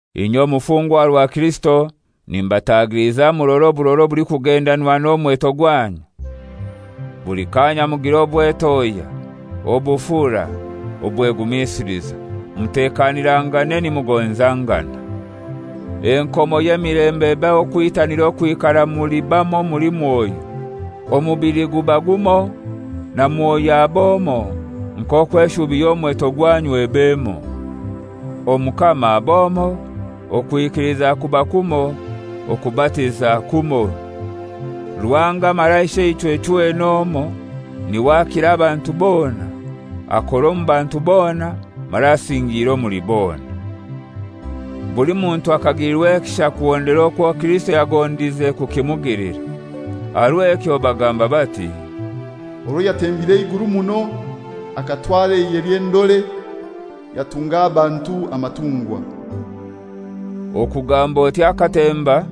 Inye omufungwa aha rwa Kirisito, nimbatagiliza murore oburora obulikugendanwa n'omweto gwanyu. Buli kaanya mugire obwetohya, obufura, obwegumisiliza, mutekanirangane nimugonzangana. Enkomo y'emilembe ebahe okwitanira okwikara muli bamoi omuli Mwoyo. Omubili guba gumoi na Mwoyo ab'omoi, nk'okwo eshubi y'omweto gwanyu eb'emoi. Omukama ab'omoi, okwikiliza kuba kumoi, okubatiza kumoi. Ruhanga mara Isheichwe chwena omoi, n'iwe akira abantu bona, akora omu bantu bona mara asingiire omuli bona. Buli muntu akagilirwa ekisha kuhondera okwo Kirisito yagondize kukimugilira. Aha rw'ekyo bagamba bati, «Orwo yatembire eiguru muno, akatwara eihe ly'endore, yatunga abantu amatungwa.» (Okugamba oti «Akatemba,»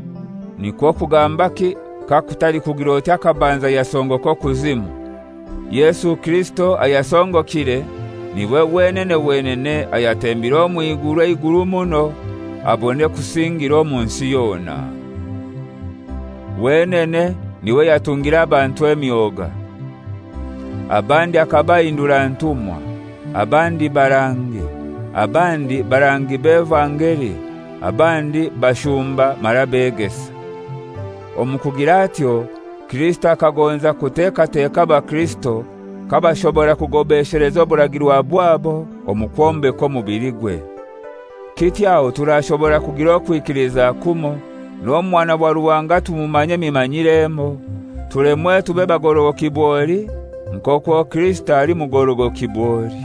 nikwo kugambaki kakutali kugir'oti akabanza yasongoka okuzimu? Yesu Kirisito ayasongokire n'iwe wenene wenene ayatembire omw'iguru eiguru muno, abone kusingira omunsi yona.) Wenene n'iwe yatungire abantu emyoga. Abandi akabahindura ntumwa, abandi barangi, abandi barangi b'evangeli, abandi bashumba mara begesa. Omu kugir'atyo Kirisito akagonza kutekateka abakirisito kabashobora kugobesheleza oburagirwa bwabo omu kwombeka omubiligwe. Kityo aho turashobora kugira okwikiliza kumoi, n'Omwana wa Ruhanga tumumanye emimanyire emoi, tulemwe tube bagorogoki bwoli nk'okwo Kirisito ali mugorogoki bwoli.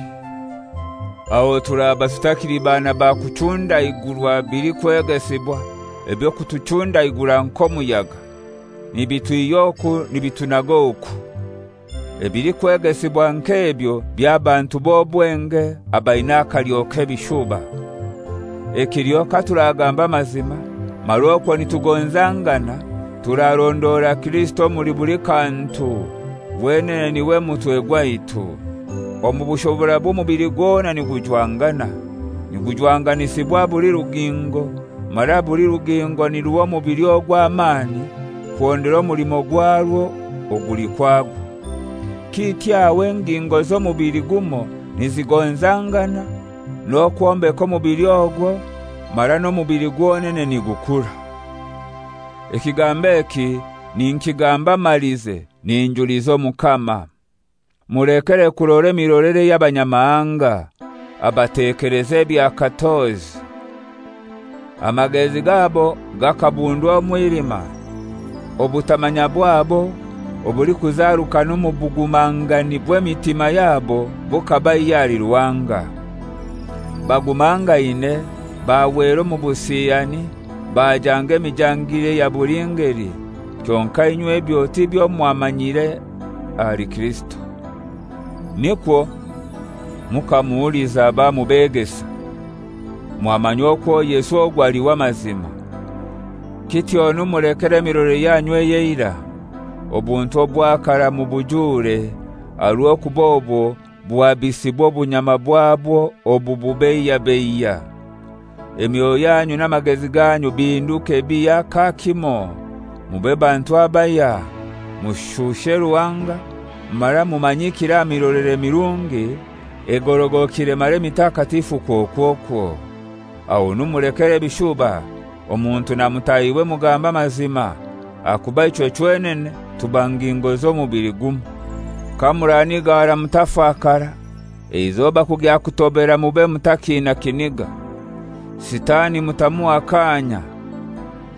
Aho turaba tutakili bana ba kuchundaigurwa bilikwegesibwa eby'okutuchundaigura nk'omuyaga, nibitwihy'oku nibitunag'oku. Ebilikwegesibwa nk'ebyo by'abantu b'obwenge abaina akalyo k'ebishuba. Ekiliho katuragamba amazima mara okwo nitugonzangana turarondora Kirisito omuli buli kantu, wenene n'iwe mutwe gwaitu. Omu bushoborabwe omubili gwona nigujwangana, nigujwanganisibwa buli rugingo, mara buli rugingo niruha omubili ogwo amani kuhondera omulimo gwarwo oguli kwagwo. Kityo aho engingo z'omubili gumoi nizigonzangana n'okwombeka omubili ogwo, mara n'omubili gwonene nigukura. Ekigambo eki ninkigamba malize ninjuliza Omukama: Mulekere kurora emirolere ey'Abanyamahanga, abatekeleza ebya katozi. Amagezi gabo gakabundwa omwilima; obutamanya bwabo obulikuzarukana omu bugumangani bw'emitima yabo bukabaihya ahali Ruhanga. Bagumangaine bahwera omu busiyani, bajanga emijangire eya buli ngeli. Kyonkai inywe ebyo tibyo mwamanyire ahali Kirisito! Nikwo, mukamuhuliza bamubegesa, mwamanya okwo Yesu ogwo ali w'amazima. Kityonu mulekere emirolere yanyu ey'eirai, obuntu obwa karai mubujure, aha rw'okuba obwo buhabisibwa obunyama bwabwo obububeiyabeiya. Emyoyo yanyu n'amagezi ganyu bihinduke bihya kakimoi, mube bantu abahya, mushushe Ruhanga, mara mumanyikire aha mirolere mirungi egorogokire mara emitakatifu kwokwokwo. Ahonu mulekere ebishuba, omuntu na mutahiwe mugambe amazima, ahakuba ichwe chwenene tuba ngingo z'omubili gumoi. Kamuranigara mutafakara, eizoba kugya kutobera mube mutakiina kiniga. Sitani mutamuha kaanya.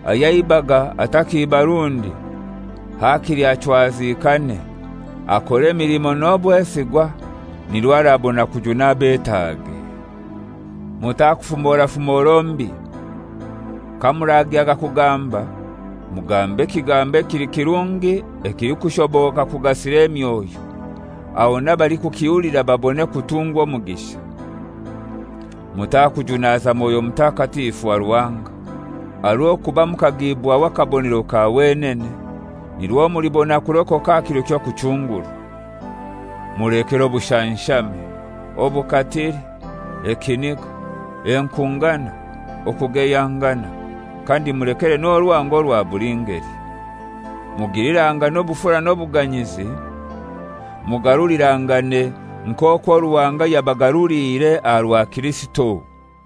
Ayaibaga atakiiba rundi. Hakili achwazikane, akore emilimo n'obwesigwa, nirwo arabona kujuna abetaage. Mutakufumora fumoro mbi. Kamuragyaga kugamba mugambe ekigambo ekili kirungi ekilikushoboka kugasira emyoyo, aho n'abalikukihulira babone kutungwa omugisha. Mutakujunaza Mwoyo Mutakatifu wa Ruhanga, aha rw'okuba mukagiibwaho akabonero ka wenene, nirwo mulibona kurokoka aha kiro ky'okuchungurwa. Mulekere obushanshame, obukatili, ekiniga, enkungana, okugeyangana, kandi mulekere n'orwango orwa buli ngeli. Mugilirangane obufura n'obuganyizi, mugarulirangane nk'okwo Ruhanga yabagaruliire aha rwa Kirisito.